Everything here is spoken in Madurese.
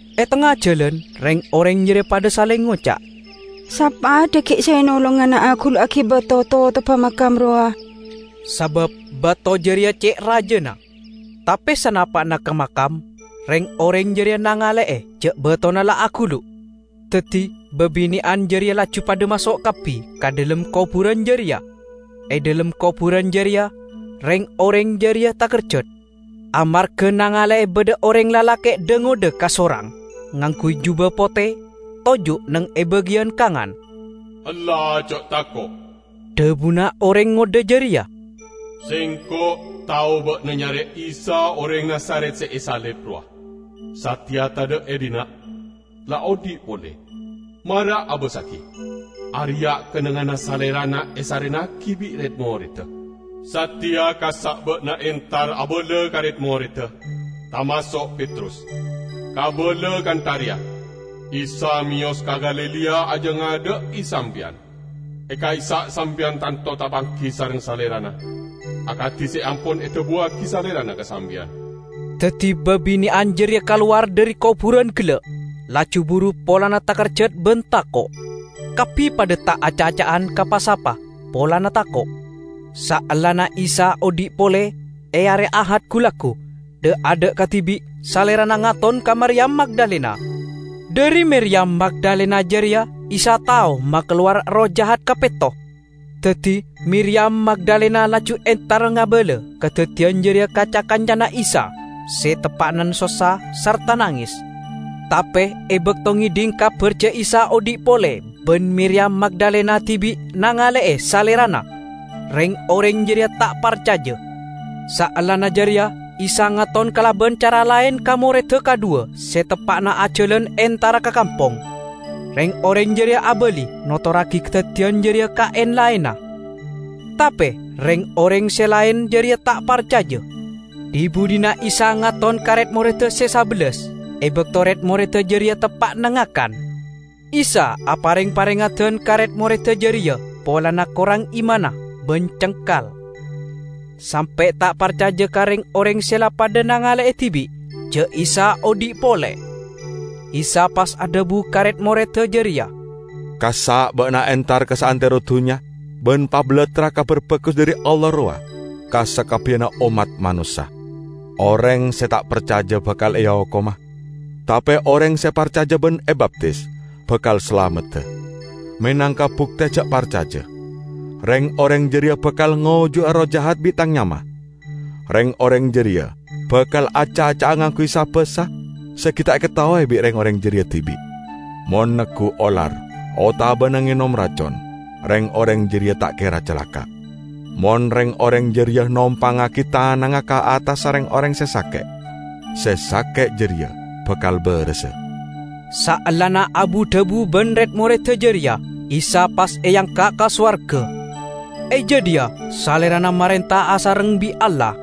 E tengnga jalan reng-oreng jareya padha saleng ngoca', "Sapa dhaggi' se nolongana agulu'agi bato totobba makam rowa?" Sabab bato jareya ce' rajana. Tape sanapa'na ka makam, reng-oreng jareya nangale'e ja' batona la agulu'. Daddi babine'an jareya laju padha maso' kabbi ka dhalem koburan jareya. E dhalem koburan jareya, reng-oreng jareya takerjat, amarga nangale'e badha oreng lalake' dha-ngodha kasorang, ngangguy juba pote, toju' neng e bagiyan kangan. "Ella ja' tako'," dhabuna oreng ngodha jareya. "Sengko' tao ba'na nyare Isa oreng Nazaret se esalib rowa. Sateya tadha' e dhinna', la odhi' pole! Mara abassagi, areya' kennengnganna Salerana esarennagi bi' red-moredda. Sateya kassa' ba'na entar abala ka red-moredda, tamaso' Petrus. Kabala kantha reya, 'Isa meyos ka Galilea ajangadha'i sampeyan. E ka'issa' sampeyan tanto tapanggi sareng Salerana, akadi se ampon edhabuwagi Salerana ka sampeyan.' " Daddi babine'an jareya kalowar dhari koburan gella', laju buru polana takerjat ban tako'. Kabbi padha ta' acaca'an ka pa-sapa, polana tako'. [Saellana Isa odhi' pole, e are Ahad gu-laggu, dha'-adha' kadibi' Salerana ngaton ka Miriyam Magdalena. (Dhari Miriyam Magdalena jareya Isa tao makalowar erroh jahat kapetto.) Daddi Miriyam Magdalena laju entar ngabala kadaddiyan jareya ka ca-kancana Isa, se teppa'na sossa sarta nanges. Tape e bakto ngedhing kabar ja' Isa odhi' pole ban Miriyam Magdalena dibi' nangale'e Salerana, reng-oreng jareya ta' parcaja. Saellana jareya Isa ngaton kalaban cara laen ka moredda kadhuwa se teppa'na ajalan entara ka kampong. Reng-oreng jareya abali, notorragi kadaddiyan jareya ka en-laenna. Tape reng-oreng se laen jareya ta' parcaja. Dhi-budhina Isa ngaton ka red-moredda se sabellas e bakto red-moredda jareya teppa'na ngakan. Isa apareng parengeddan ka red-moredda jareya polana korang imanna ban cengkal sampe' ta' parcaja ka reng-oreng se la padha nangale'e dibi' ja' Isa odhi' pole. Isa pas adhabu ka red-moredda jareya, "Kassa' ba'na entar ka saantero dunnya ban pabalattra Kabar Bagus dhari Allah rowa ka sakabbiyanna ommat manossa. Oreng se ta' parcaja bakal eokoma. Tape oreng se parcaja ban ebaptis, bakal salamedda. Menangka bukte ja' parcaja, reng-oreng jareya bakal ngojuga erroh jahat bit Tang nyama; reng-oreng jareya bakal acaca'a ngangguy sa-basa se gi' ta' ekataowe bi' reng-oreng jareya dibi'. Mon neggu' olar otabana ngenom racon, reng-oreng jareya ta' kera calaka'. Mon reng-oreng jareya nompangngagi tanangnga ka attassa reng-oreng se sake', se sake' jareya bakal barasa." Saellana abu-dhabu ban red-moredda jareya, Isa pas eangka' ka sowarga. E jadhiya Salerana marenta asareng bi' Allah.